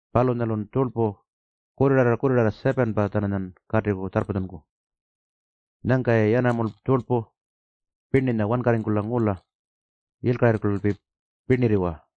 Palunyalun tjurlpu kurrirarra-kurrirarra 7-pa-tjananya katiku tjarrpatjunku. Nyangka-yayi yanamulpa puru tjurlpu pirninya wankarringkula ngula yilkakurringkulalpi pirnirriwa.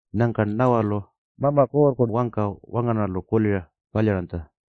Nyangka Nawalu Mama Kuurrku wangka wangarnarralu kulira palyaranytja.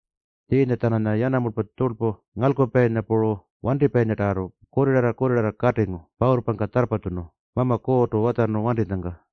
Tjiinya-tjananya yanamulpa tjurlpu ngalkupayinya puru wantipayinyatarrartu kurrirarra-kurrirarra katingu pawurrpangka tjarrpatjunu Mama Kuurrtu watjarnu wantinyangka.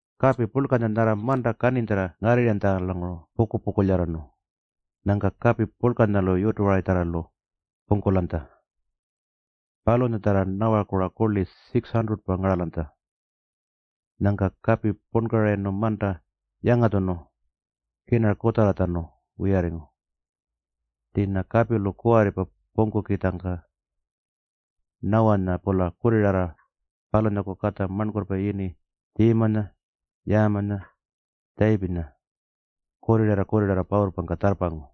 Kapi purlkanya nyarra manta kaninytjarra ngarrirranytjalanguru puku-pukulyarrarnu. Nyangka kapi purlkanyalu yutuwaritjarralu pungkulanytja. Palunyatjarra Nawaku-ra kurli 600-pa ngaralanytja. Nyangka kapi punkarayirnu manta yangatjunu kirnara kutjarratjanu wiyarringu. Tjiinya kapilu kuwarripa pungkukitjangka Nawanya-pula kurrirarra, palunyaku katja marnkurrpa yini Tjiimanya, Yaamanya, Tjayipinya kurrirarra-kurrirarra pawurrpangka tjarrpangu.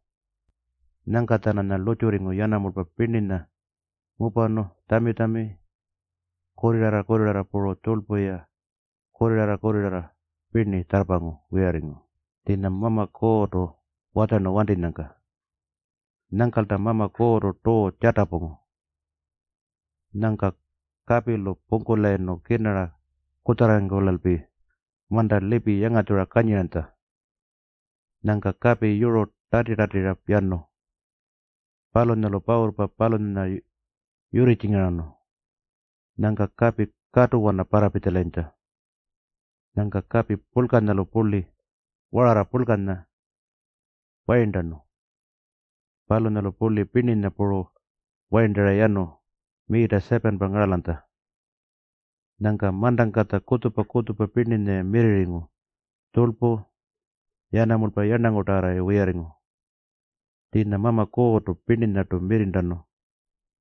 Nyangka-tjananya lurrtjurringu yanamulpa pirninya ngupanu, tjami-tjami, kurrirarra-kurrirarra puru tjurlpu-ya kurrirarra-kurrirarra pirni tjarrpangu wiyarringu tjiinya Mama Kuurrtu watjarnu wantinyangka. Nyangkalta Mama Kuurrtu tuu tjatapungu. Nyangka kapilu pungkulayirnu kirnara kutjarrarringkulalpi manta lipi yangatjura kanyiranytja. Nyangka kapi yuru tati-tatira yanu. Palunyalu pawurrpa palunyanya yurritjingarnu. Nyangka kapi katuwana parrapitjalayintja. Nyangka kapi purlkanyalu purli wararra purlkanya wayirntanu. Palunyalu purli pirninya puru wayirntara yanu miita 7-pa ngaralanytja. Nyangka mantangkatja kutjupa-kutjupa pirninya-ya mirrirringu, tjurlpu, yanamulpa puru yarnangutarrartu-ya wiyarringu. Tjiinya Mama Kuurrtu pirninyartu mirrirntanu.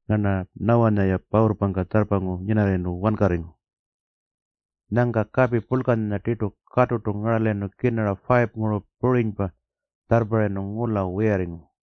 Ngarna Nawanya-ya pawurrpangka tjarrpangu nyinarrayirnu wankarringu. Nyangka kapi purlkanya tirtu katurtu ngaralayirnu, kirnara 5-nguru purinypa tjarrparrayirnu ngula wiyarringu.